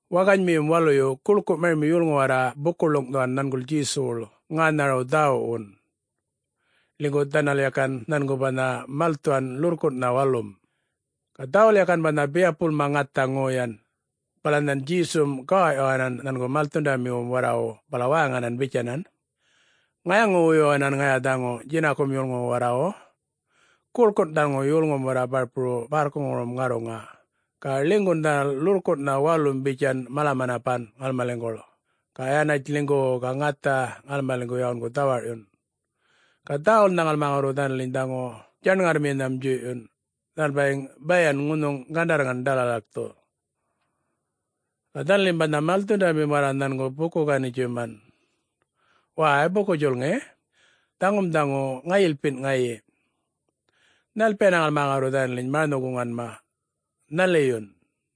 Waŋganymiyum waluyu guḻku marimi yolŋu warra buku-ḻuŋꞌthuwan nhanguḻ Djesuwuḻ ŋänharawu dhäwuwun. Ḻinygu dhanal yakan nhangu banha malthuwan ḻurrkunꞌnha walum, ga dhawul yakan banha biyapuḻma ŋatha ŋoyan. Bala nhan Djesum gawawꞌyuwanan nhangu malthundamiwum warrawu bala wäŋanan bitjanan, “Ŋayaŋu-wuyuwanan ŋaya dhaŋu djinakum yolŋuwu warrawu. Guḻkun dhaŋu yolŋum warra barpuru bärrkuŋurum ŋarruŋa ga ḻinygun dhanal ḻurrkunꞌnha walum bitjan mala-manapanma ŋalmaliŋguḻ ga yanatj ḻinygu-u-u ga ŋatha ŋalmaliŋgu yawungu dhawarꞌyun. Ga dhäwulnha ŋalma ŋarru dhanaliny dhaŋu djaṉŋarrminham djuyꞌyun, dhanal bayiŋ bayan ŋunhuŋ gandarrŋan ḏalalakthu. Ga dhanalim banha malthundamim warra nhangu buku-ganitjuman, “Wäy, buku-djulŋi, dhaŋum dhaŋu ŋayilpinꞌ ŋayi,... nhalpiyana ŋalma ŋarru dhanaliny maranhu-guŋanma... nhaliyun?”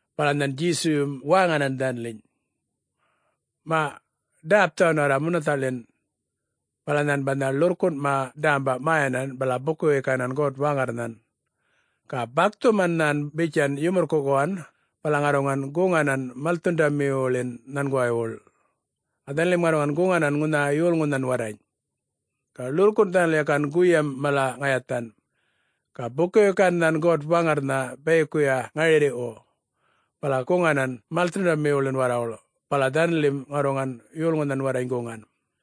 Bala nhan Djesuyum wäŋanan dhanaliny, “Maꞌ ḏäpthuwan warra munathaꞌḻin.” Bala nhan banha ḻurrkunꞌma ḏämba mäyanan bala buku-wikanan God-Waŋarrnhan. Ga bakthuman nhan bitjan yumurrkuꞌkuwan bala ŋarruŋan guŋanan malthundamiwuḻin nhanguwaywuḻ. Ga dhanalim ŋarruŋan guŋanan ŋunha yolŋunhan warrany. Ga ḻurrkunꞌ dhanal yakan guyam mala ŋayathan. Ga buku-wikan nhan God-Waŋarrnha bayikuya ŋarirriꞌwu, bala guŋanan malthundamiwuḻin warrawuḻ bala dhanalim ŋarruŋan yolŋunhan warrany guŋan.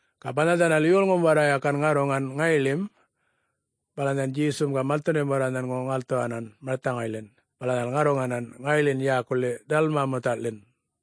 Ga banha dhanal yolŋum warra yakan ŋarruŋan ŋayiḻim, bala nhan Djesum ga malthundamim warra nhangu ŋalthuwanan marthaŋayḻin bala dhanal ŋarruŋanan, ŋayiḻin yäkuḻi Dalmanuthaḻin.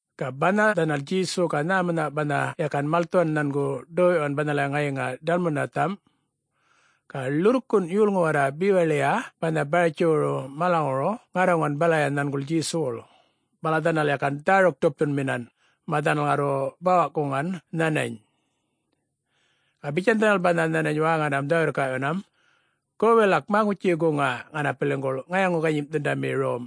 Ga banha dhanal Djesu ga nhämunha banha yakan malthuwan nhangu, ḏoyꞌyuwan banhalaya ŋayiŋa Dalmanutham. Ga ḻurrkunꞌ yolŋu warra bewaḻiya banha Baratjiwuru malaŋuru ŋarruŋan balaya nhanguḻ Djesuwuḻ, bala dhanal yakan dhäruk-ḏupthunminan mä dhanal ŋarru bawaꞌkuŋan nhanany. Ga bitjan dhanal banha nhanany wäŋanam dhä-wirrkaꞌyuwanam, “Go, wilak maŋutji-guŋa ŋanapiliŋguḻ ŋayaŋu-ganyimꞌthundami rom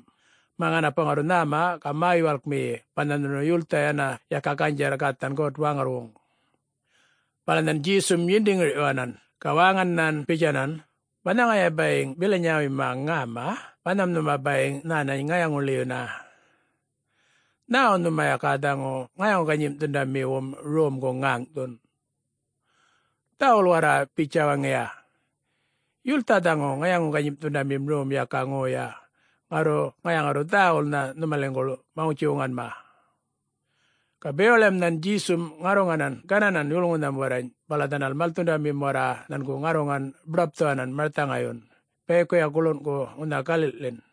mä ŋanapu ŋarru nhäma ga mä-yuwalkmiyi banha nhunu yultha yana yaka ganydjarr gathan God-Waŋarrwuŋ!” Bala nhan Djesum yindi-ŋirꞌyuwanan ga wäŋan nhan bitjanan, “Banha ŋaya bayiŋ bilanyawuyma ŋäma, banham nhuma bayiŋ nhänany ŋayaŋu-ḻiyuna! Nhäwu nhuma yaka dhaŋu ŋayaŋu-ganyimꞌthundamiwum romgu ŋäŋꞌthun? Dhäwul warra bitja waŋiya. Yultha dhaŋu ŋayaŋu-ganyimꞌthundamim rom yaka ŋoya, ŋarru ŋaya ŋarru dhäwulnha nhumaliŋgu maŋutji-wuŋanma.” Ga bewaḻiyam nhan Djesum ŋarruŋanan gananan yolŋunham warrany bala dhanal malthundamim warra nhangu ŋarruŋan buḏapthuwanan marthaŋayyun bayikuya guḻunꞌku ŋunha galiꞌḻin.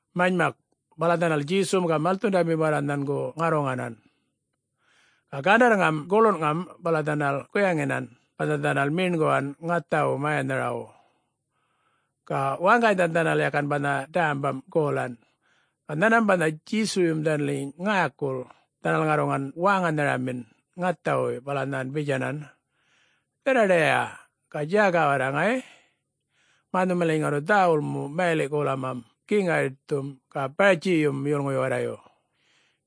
Manymak, bala dhanal Djesum ga malthundamim warra nhangu ŋarruŋanan. Ga gandarrŋam guḻunŋam bala dhanal guyaŋinan banha dhanal meṉguwan ŋathawu mäyanharawu. Ga waŋganynha dhanal yakan banha dämbam golan. Ga nhanmam banha Djesuyum dhanaliny ŋäkul, dhanal ŋarruŋan wäŋanharamin ŋathawuy bala nhan bitjanan, “Dharraḏayiya, ga djäga warra ŋay, mä nhumaliny ŋarru dhäwul mu mayaliꞌ-golamam Geŋ Yaritthum ga Baratjiyum yolŋuyu warrayu,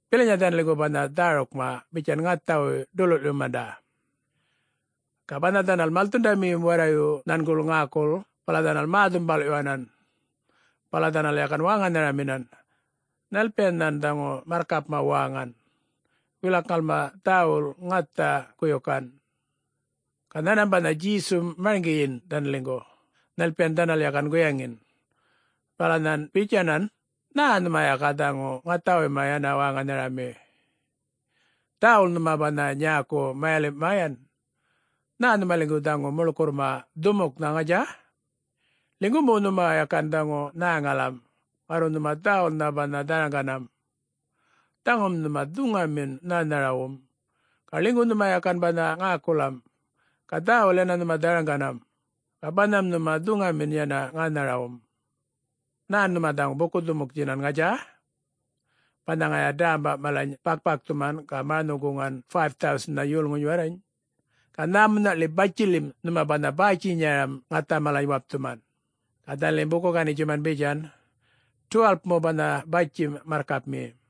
bilanya dhanaliŋgu banha dhärukma bitjan ŋathawuy ḏululꞌyumanda.” Ga banha dhanal malthundamiyum warrayu nhanguḻ ŋäkul bala dhanal mä-dhumbalꞌyuwanan. Bala dhanal yakan wäŋanharaminan, “Nhalpiyan nhan dhaŋu marrkapma wäŋan,... wilak ŋalma dhäwul ŋatha guyukan?” Ga nhanmam banha Djesum marŋgiyin dhanaliŋgu nhalpiyan dhanal yakan guyaŋin, bala nhan bitjanan, “Nhä nhuma yaka dhaŋu ŋathawuyma yana wäŋanharami,... dhäwul nhuma banha nyäku mayalimꞌ mäyan? Nhä nhumaliŋgu dhaŋu muḻkurrma dhumuknha, ŋatja? Ḻinygu mu nhuma yakan dhaŋu nhäŋalam, ŋarru nhuma dhäwulnha banha dharaŋganam. Dhaŋum nhuma dhuŋamin nhänharawum. Ga ḻinygu nhuma yakan banha ŋäkulam, ga dhäwul yana nhuma dharaŋganam, ga banham nhuma dhuŋamin yana ŋänharawum. Nhän nhuma dhaŋu buku-dhumuktjinan, ŋatja? Banha ŋaya dämba malany bakꞌ-bakthuman ga maranhu-guŋgan 5000-nha yolŋuny warrany? Ga nhämunhaꞌḻi batjiḻim nhuma banha bäytjinyaram ŋatha malany wapthuman?” Ga dhanalim buku-ganitjuman bitjan, “12-mu banha batjim, marrkapmi!”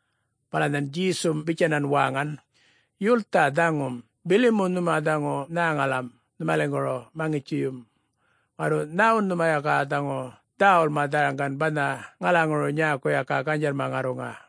Bala nhan Djesum bitjanan wäŋan, “Yultha dhaŋum, bili mu nhuma dhaŋu nhäŋalam nhumaliŋguru maŋutjiyum, ŋarru nhäwun nhuma yaka dhaŋu dhäwulma dharaŋgan banha ŋalaŋuru nyäku yaka ganydjarr ŋarruŋa?”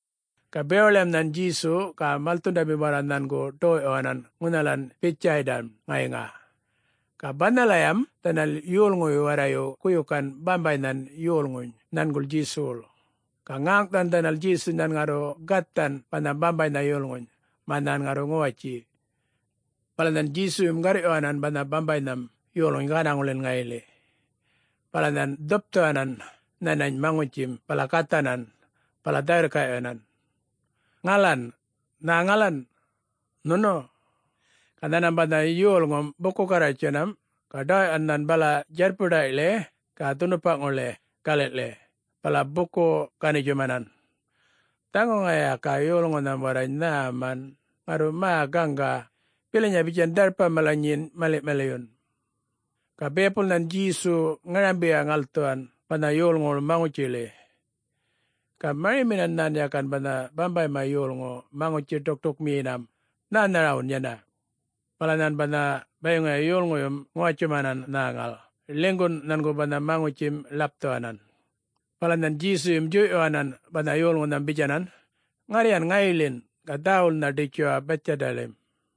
Ga bewaḻiyam nhan Djesu ga malthundamim warra nhangu ḏoyꞌyuwanan ŋunhalan Bithdjaydam-n ŋayiŋa. Ga banhalayam dhanal yolŋuyu warrayu guyukan bambaynhan yolŋuny nhanguḻ Djesuwuḻ, ga ŋäŋꞌthuwan dhanal Djesuny nhan ŋarru gathan banha bambaynha yolŋuny, mä nhan ŋarru ŋuwatji. Bala nhan Djesuyum garrꞌyuwanan banha bambaynham yolŋuny gänaŋuḻin ŋayiḻi. Bala nhan dhupthuwanan nhanany maŋutjim bala gathanan, bala dhä-wirrkaꞌyuwanan, “Ŋalan, nhäŋalan,... nhunu?” Ga nhanmam banha yolŋum buku-garrwartjinam ga ḏawaꞌyuwan nhan bala djarrpuḏayꞌḻi ga dhunupaḻi galiꞌḻi, bala buku-ganitjumanan, “Dhaŋu ŋaya yaka yolŋunham warrany nhäman, ŋarru mä gaŋga, bilanya bitjan dharpa malany nyin maliꞌ-maliyun!” Ga biyapul nhan Djesu ŋarambiya-ŋalthuwan banha yolŋuwuḻ maŋutjiḻi. Ga mariminan nhan yakan banha bambayma yolŋu maŋutji-ḏukṯukmiyinam nhänharawun yana. Bala nhan banha bayiŋuya yolŋuyum ŋuwatjuwmanan nhäŋal, ḻinygun nhangu banha maŋutjim ḻapthuwanan. Bala nhan Djesuyum djuyꞌyuwanan banha yolŋunham bitjanan, “Ŋarryan ŋayiḻin, ga dhäwulnha ḏitjuwa Bithdjaydaḻim.”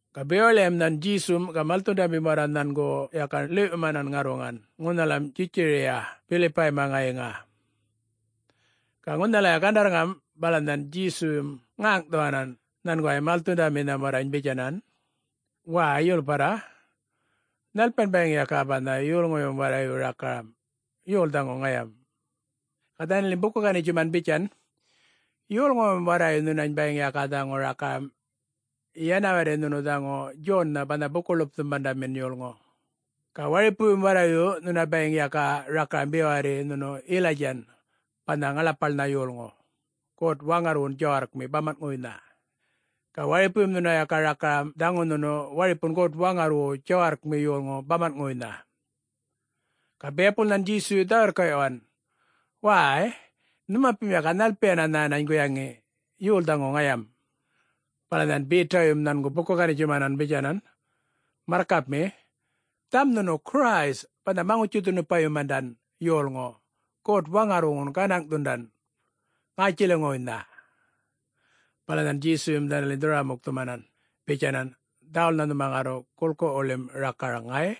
Ga bewaḻiyam nhan Djesum ga malthundamim warra nhangu yakan ḻiwꞌyumanan ŋarruŋan ŋunhalam Djitjariya Bilipayma ŋayiŋa. Ga ŋunhalaya gandarrŋam bala nhan Djesuyum ŋäŋꞌthuwanan nhanguway malthundaminham warrany bitjanan, “Wäy, yulparra, nhalpiyan bayiŋ yaka banha yolŋuyum warrayu rakaram,... yol dhaŋu ŋayam?” Ga dhanalim buku-ganitjuman bitjan, “Yolŋuyum warrayu nhunany bayiŋ yaka dhaŋu rakaram yana warri nhunu dhaŋu Djonnha banha Buku-ḻupthundamin yolŋu. Ga waripuyum warrayu nhuna bayiŋ yaka rakaram be warri nhunu Yilaydjan banha ŋaḻapaḻnha yolŋu God-Waŋarrwun djawarrkmi bamanꞌŋuwuynha. Ga waripuyum nhuna yaka rakaram, dhaŋu nhunu waripun God-Waŋarrwu djawarrkmi yolŋu bamanꞌŋuwuynha.” Ga biyapul nhan Djesuyu dhä-wirrkaꞌyuwan, “Wäy-y, nhumapim yaka nhalpiyan nhänany guyaŋi,... yol dhaŋu ŋayam?” Bala nhan Betayum nhangu buku-ganitjuman bitjanan, “Marrkapmi, dhaŋum nhunu Christ banha Maŋutji-dhunupayumandan yolŋu God-Waŋarrwuŋun gänaŋꞌthundan ŋätjiliŋuwuynha.” Bala nhan Djesuyum dhanaliny dhurrwara-mukthumanan bitjanan, “Dhäwulnha nhuma ŋarru guḻkuwuḻim rakaraŋ ŋay!”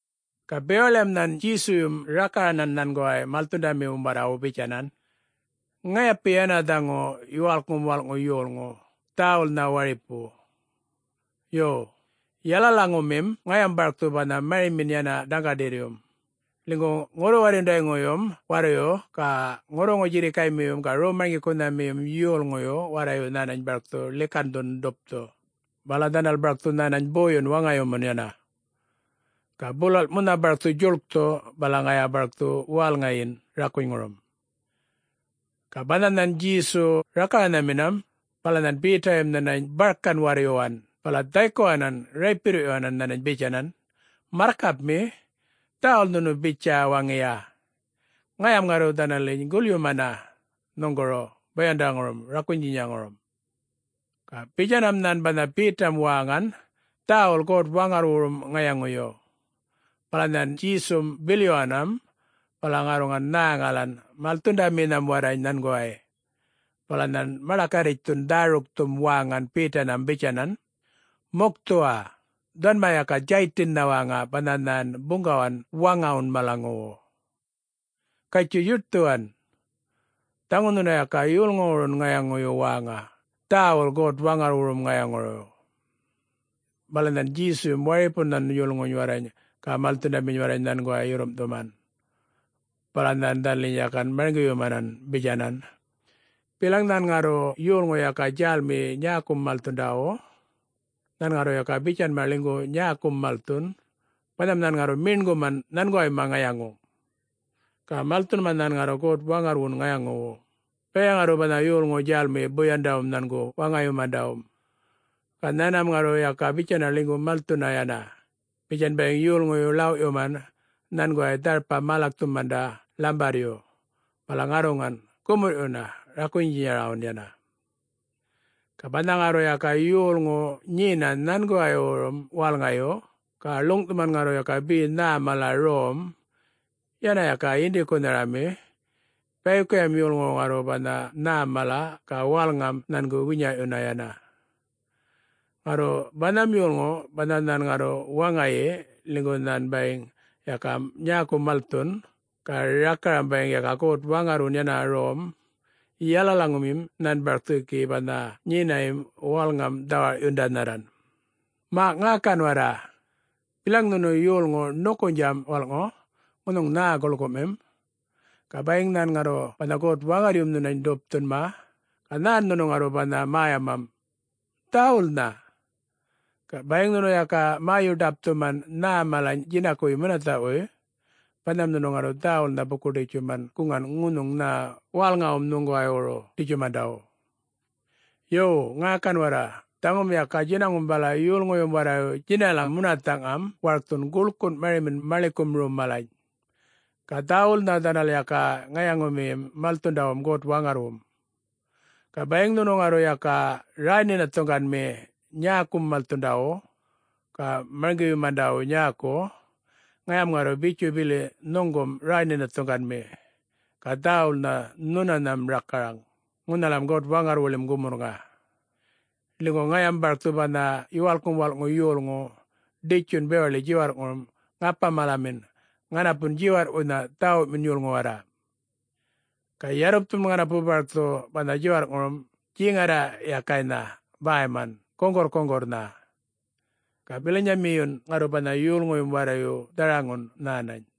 Ga bewaḻiyam nhan Djesuyum rakaranan nhanguway malthundamiwum warrawu bitjanan, “Ŋayapi yana dhaŋu Yuwalkŋum Walꞌŋu Yolŋu, dhäwulnha wiripu. Yo, yalalaŋumim ŋayam barkthu banha marimin yana dhaŋgaḏirryum, ḻinygu ŋurru-warryundayŋuyum warrayu ga ŋurruŋu-djirrikaymiyum ga rom-marŋgikunhamiyum yolŋuyu warrayu nhänany barkthu ḻikandhu-ḏupthun, bala dhanal barkthu nhänany boyun waŋayumun yana. Ga bulalꞌ munha barkthu djuḻkthu bala ŋaya barkthu wälŋayin rakunyŋurum.” Ga banha nhan Djesu rakaranhaminam, bala nhan Betayum nhanany barkan warryuwan bala dhaykuwanan raypirriꞌyuwanan nhanany bitjanan, “Marrkapmi, dhäwul nhunu bitja waŋiya! Ŋayam ŋarru dhanaliny gulyumana nhuŋguru boyandaŋurum rakunykunhaŋurum.” Ga bitjanam nhan banha Betam wäŋan dhäwul God-Waŋarrwurum ŋayaŋuyu. Bala nhan Djesum bilyuwanam bala ŋarruŋan nhäŋalan malthundaminham warrany nhanguway, bala nhan maḏakarritjthun dhärukthum wäŋan Betanham bitjanan, “Mukthuwa! Dhuwanma yaka Djaytinnha wäŋa banha nhan buŋgawan waŋawun malaŋuwu. Gatjuy yuṯthuwan. Dhaŋu nhunu yaka yolŋuwurun ŋayaŋuyu wäŋa, dhäwul God-Waŋarrwurum ŋayaŋuyu.” Bala nhan Djesuyum waripunham yolŋuny warrany ga malthundaminy warrany nhanguway yurrumꞌthuman, bala nhan dhanaliny yakan marŋgiyumanan bitjanan, “Bilaŋ nhan ŋarru yolŋu yaka djälmiyi nyäkum malthundawu, nhan ŋarru yaka bitjanma ḻinygu nyäkum malthun, banham nhan ŋarru meṉguman nhanguwayma ŋayaŋu, ga malthunma nhan ŋarru God-Waŋarrwun ŋayaŋuwu, bayaya ŋarru banha yolŋu djälmiyi boyandawum nhangu waŋayumandawum. Ga nhanmam ŋarru yaka bitjana ḻinygu malthuna yana, bitjan bayiŋ yolŋuyu ḻawꞌyuman nhanguway dharpa-mälakthumanda ḻambarryu, bala ŋarruŋan gumurrꞌyuna rakunydjinyarawun yana. Ga banha ŋarru yaka yolŋu nyena nhanguwaywurum wälŋayu, ga ḻuŋꞌthuman ŋarru yaka be nhä mala rom, yana yaka yinḏikunharami, bayikuyam yolŋuwu ŋarru banha nhäm mala ga wälŋam nhangu winyaꞌyuna yana. Ŋarru banham yolŋu, banha nhan ŋarru waŋayi ḻinygu nhan bayiŋ yaka nyäku malthun, ga rakaram bayiŋ yaka God-Waŋarrwun yana rom, yalalaŋumim nhan barkthu gi banha nyinayim wälŋam dhawarꞌyundanharran. Maꞌ ŋäkan warra! Bilaŋ nhunu yolŋu ṉukunydjam walꞌŋu, ŋunhuŋ nhä guḻkumim, ga bayiŋ nhan ŋarru banha God-Waŋarryum nhunany ḏupthunma, ga nhän nhunu ŋarru banha mäyamam? Dhäwulnha! Ga bayiŋ nhunu yaka mäyu-ḏapthuman nhä malany djinakuwuy munathaꞌwuy, banham nhunu ŋarru dhäwulnha buku-djuḻkthuman guŋan ŋunhuŋ nhä wälŋawum nhuŋguwaywuru ḏitjumandawu! Yo, ŋäkan warra! Dhaŋum yaka djinaŋum bala yolŋuyum warrayu djinalam munathaꞌŋam warkthun guḻkun marimin maḻikum rom malany. Ga dhäwulnha dhanal yaka ŋayaŋumiyim malthundawum God-Waŋarrwum. Ga bayiŋ nhunu ŋarru yaka räy-nhinathuŋganmi nyäkum malthundawu, ga marŋgiyumandawum nyäku, ŋayam ŋarru bitju bili nhuŋgum räy-nhinathuŋganmi, ga dhäwulnha nhunanham rakaraŋ ŋunhalam God-Waŋarrwuḻim gumurrŋa. Ḻinygu ŋayam barkthu banha Yuwalkŋum Walꞌŋu Yolŋu, ḏitjun bewaḻi djiwarrꞌŋurum ŋapa-malamin ŋanapun djiwarrꞌwuynha dhäwumin yolŋu warra. Ga yarrupthum ŋanapu barkthu banha djiwarrꞌŋurum djeŋarraꞌyakaynha bäyman guŋgurrkuŋgurrnha, ga bilanyamiyun ŋarru banha yolŋuyum warrayu dharaŋgum nhänany.